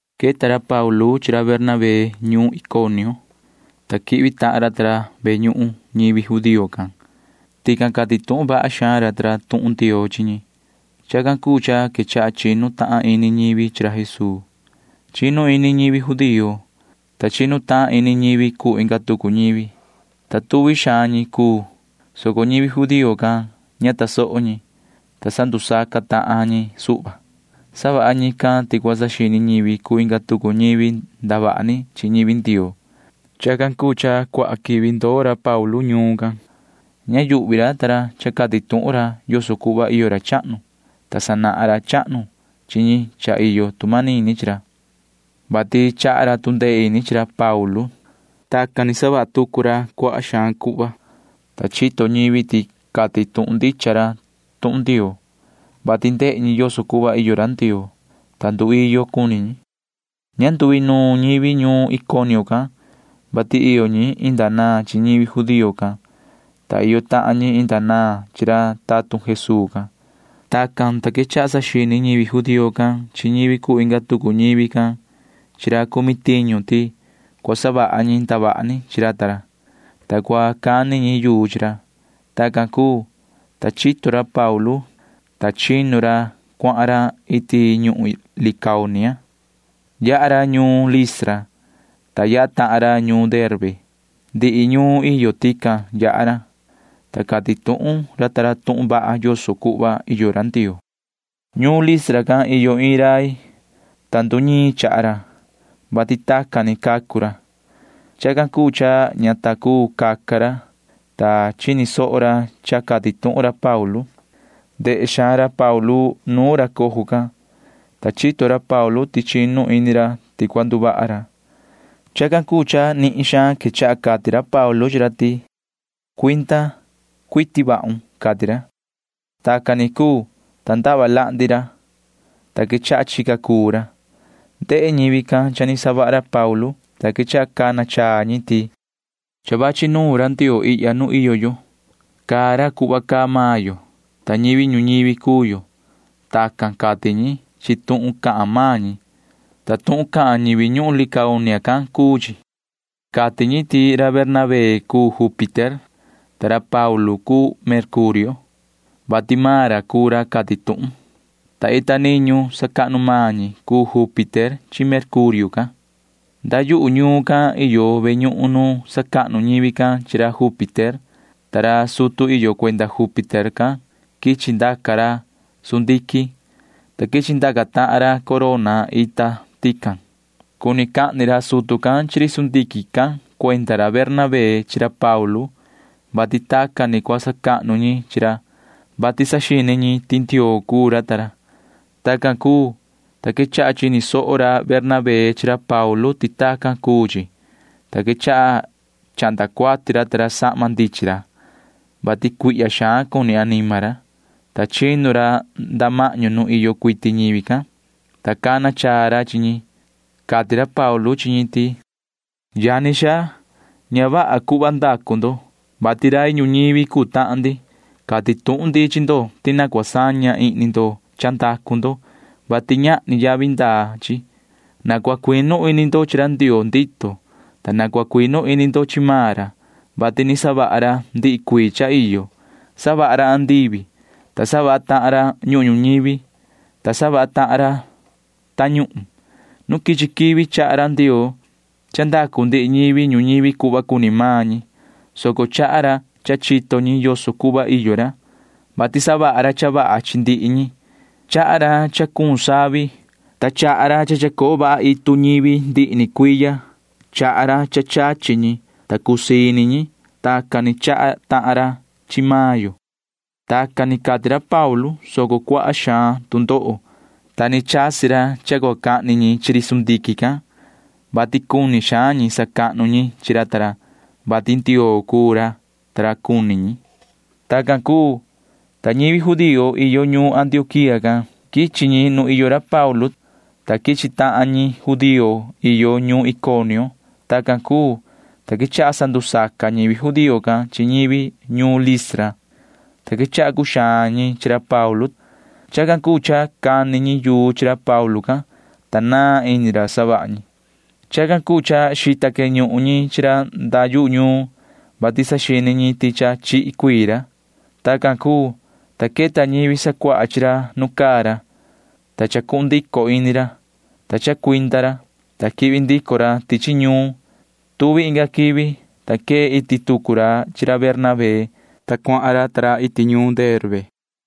Queta ra Paulu chi ra Bernabé ñuun Iconio, ta quihvi tahan ra ta ra ve ñuhun ñivi judío can. Tican cati tuhun vaha xaan ra ta ra tuhun Ndioo chi ñi. Chacan cuu cha quechaha chinu tahan ini ñivi chi ra Jesuu. Chinu ini ñivi judío, ta chinu tahan ini ñivi cuu inga tucu ñivi, ta tuvi xaan ñi cuu, soco ñivi judío can ña tasoho ñi, ta sandusaca tahan ñi suhva. Savaha ñican ti cua saxini ñivi cuu inga tucu ñivi ndavaha ni chi ñivi Ndioo. Chacan cuu cha nducuaha quivi ndoo ra Paulu ta ra ñuun can. Ña yuhvi ra ta ra cha cati tuhun ra yoso cuhva iyo ra chahnu, ta sanahan ra chahnu chi ñi cha iyo tu manini chi ra, vati chaha ra tu ndee ini chi ra Paulu ta ra. Tacan ni savaha tahan tucu ra cuaha xaan cuhva, ta chito ñivi ti cati tuhun ndicha ra tuhun Ndioo, vati ndehe ñi yoso cuhva iyo ra Ndioo, ta nduiyo cuni ñi. Ña nduinuun ñivi ñuun Iconio can, vati iyo ñi inda naan chi ñivi judío can, ta iyo tahan ñi inda naan chi ra tatun Jesuu can. Tacan, ta quechaha saxini ñivi judío can chi ñivi cuu inga tucu ñivi can chi ra cumi tiñu ti cua savaha ñi ndavaha ni chi ra ta ra, ta cua cani ñi yuu chi ra. Tacan cuu, ta chito ra Paulu ta ra, ta chinu ra cuahan ra iti ñuhun Licaonia. Yaha ra ñuun Listra, ta yaha tahan ra ñuun Derbe. Ndihi ñuun iyo tican yaha ra, ta cati tuhun ra tuhun vaha yoso cuhva iyo Ndioo. Ñuun Listra can iyo iin rai, ta nduñiin chaha ra, vati tacan ni cacu ra. Chacan cuu cha ña ta cuu caca ra, ta chini soho ra cha cati tuhun ra Paulu. Ndehe xaan ra Paulu nuun ra cojo can, ta chito ra Paulu ti chinu ini ra ti cua nduvaha ra. Chacan cuu cha nihin xaan quechaha cati ra Paulu chi ra ti: ―Cuinda cuiti vahun ―cati ra. Tacan ni cuu, ta ndava lahndi ra, ta quechaha chica cuu ra. Ndehe ñivi can cha ni savaha Paulu, ta quechaha cana chaa ñi ti: ―Cha vachi nuun ra ndioo ihya nu iyo yo. Caa ra cuhva caa maan yo, ta ñivi ñuñivi cuu yo. Tacan cati ñi chi tuhun cahan maan ñi, ta tuhun cahan ñivi ñuhun Licaonia can cuu chi. Cati ñi ti ra Bernabé cuu Júpiter, ta ra Paulu cuu Mercurio, vati maan ra cuu ra cati tuhun, [ta ita niñu sacahnu maan ñi cuu Júpiter chi Mercurio can]. Nda yuhu ñuun can iyo ve ñuhun nu sacahnu ñivi can chi ra Júpiter, ta ra sutu iyo cuenda Júpiter can quichi ndaca ra sundiquin, ta quichi ndaca tahan ra corona ita tican. Cuni cahni ra sutu can chi ri sundiquin can cuenda ra Bernabé chi ra Paulu, [vati tacan ni cua sacahnu ñi chi ra, vati saxini ñi ti ndioo cuu ra]. Tacan cuu, ta quechaha chini soho ra Bernabé chi ra Paulu ti tacan cuu chi, ta quechaha chahnda cuati ra ta ra sahma ndichin ra, [vati cuihya xaan cuni anima ra,] ta chinu ra nda mahñu nu iyo cuiti ñivi can, ta cana chaa ra chi ñi. Cati ra Paulu chi ñi ti: ―Yani xaa, ña vaha cuhva ndacu ndo, vati rai ñuñivi cuu tahan ndi. Cati tuhun ndi chi ndo ti na cua saña ihni ndo cha ndacu ndo, vati ñahni yavi ndaa chi. Na cua cuinu ini ndo chi ra Ndioo ndito. Na cua cuinu ini ndo chi maan ra, vati ni savaha ra ndihi cuii cha iyo. Savaha ra andivi, ta savaha tahan ra ñuhun ñuñivi, ta savaha tahan ra tañuhun. Nu quichi quivi chaha ra Ndioo cha ndacu ndihi ñivi ñuñivi cuhva cuni maan ñi, soco chaha ra cha chito ñi yoso cuhva iyo ra, vati savaha ra cha vaha chi ndihi ñi. Chaha ra cha cuun savi, ta chaha ra cha chacoo vaha itu ñivi ndihi ni cuiya. Chaha ra cha chachi ñi, ta cusii ini ñi. Tacan ni chaha tahan ra chi maan yo. Tacan ni cati ra Paulu, soco cuaha xaan tu ndoho, ta ni chasi ra cha cua cahni ñi chi ri sundiquin can, vati cuni xaan ñi sacahnu ñi chi ra ta ra, [vati ndioo cuu ra cuni ñi]. Tacan cuu, ta ñivi judío iyo ñuun Antioquía can―quichi ñi nu iyo ra Paulu ta ra, ta quichi tahan ñi judío iyo ñuun Iconio. Tacan cuu, ta quechaha sandusaca ñivi judío can chi ñivi ñuun Listra, ta quechaha cuxaan ñi chi ra Paulu ta ra. Chacan cuu cha cani ñi yuu chi ra Paulu can, ta naan ini ra suhva savaha ñi. Chacan cuu cha xita queñuhun ñi chi ra nda yu ñuun, vati saxini ñi ti cha chihi cuii ra. Tacan cuu, ta queta ñivi sacuaha chi ra nu caa ra, ta chacuhun ndico ini ra, ta chacuinda ra, ta quihvi ndico ra tichi ñuun. Tuvi inga quivi, ta quee iti tucu ra chi ra Bernabé, ta cuahan ra ta ra iti ñuun Derbe.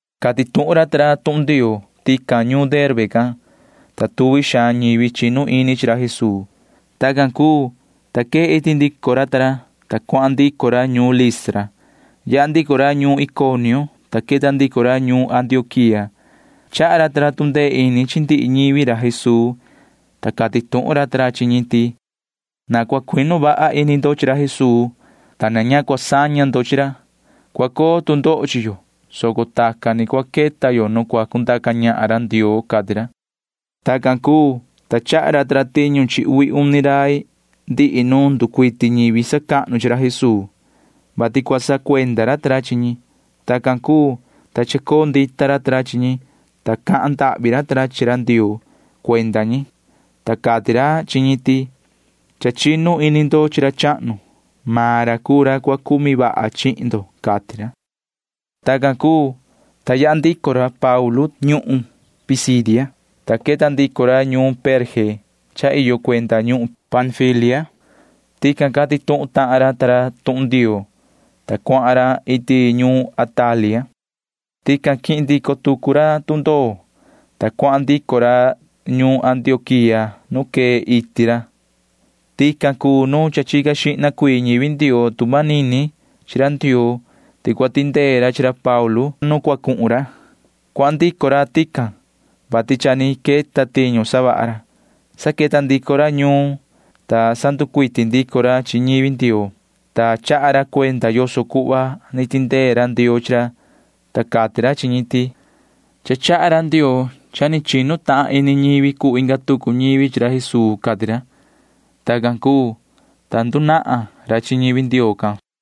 Cati tuhun ra ta ra tuhun Ndioo tican ñuun Derbe can, ta tuvi xaan ñivi chinu ini chi ra Jesuu. Tacan cuu, ta quee iti ndico ra ta ra, ta cuahan ndico ra ñuun Listra. Yaha ndico ra ñuun Iconio, ta queta ndico ra ñuun Antioquía. Chaha ra ta ra tu ndee ini chi ndihi ñivi ra Jesuu, ta cati tuhun ra ta ra chi ñi ti: ―Na cua cuinu vaha ini ndo chi ra Jesuu, ta na ña cua saña ndo chi ra. Cua coo tu ndoho chi yo, soco tacan ni cua queta yo nu cua cundaca ñahan ra Ndioo ―cati ra. Tacan cuu, ta chaha ra ta ra tiñu chi uvi uni rai ndihi nu nducuiti ñivi sacahnu chi ra Jesuu, vati cua sacuenda ra ta ra chi ñi. Tacan cuu, ta chacoo ndita ra ta ra chi ñi, ta cahan ndahvi ra ta ra chi ra Ndioo cuenda ñi, ta cati ra chi ñi ti: ―Cha chinu ini ndo chi ra chahnu. Maan ra cuu ra cua cumi vaha chihin ndo ―cati ra. Tacan cuu, ta yaha ndico ra Paulu ta ra ñuhun Pisidia, ta queta ndico ra ñuun Perge cha iyo cuenda ñuhun Panfilia. Tican cati tuhun tahan ra ta ra tuhun Ndioo, ta cuahan ra iti ñuun Atalia. Tican quihin ndico tucu ra tundoo, ta cuahan ndico ra ñuun Antioquía nu ni quee iti ra. Tican cuu nu cha chica xihna cuii ñivi Ndioo tu manini chi ra Ndioo ti cua tindee ra chi ra Paulu ta ra nu cua cuhun ra. Cuahan ndico ra tican, vati cha ni queta tiñu savaha ra. Sa queta ndico ra ñuun, ta sanducuiti ndico ra chi ñivi Ndioo, ta chaha ra cuenda yoso cuhva ni tindee ra Ndioo chi ra, ta cati ra chi ñi ti: ―Cha chaha ra Ndioo cha ni chinu tahan ini ñivi cuu inga tucu ñivi chi ra Jesuu ―cati ra. Tacan cuu, ta ndunahan ra chi ñivi Ndioo can suhva.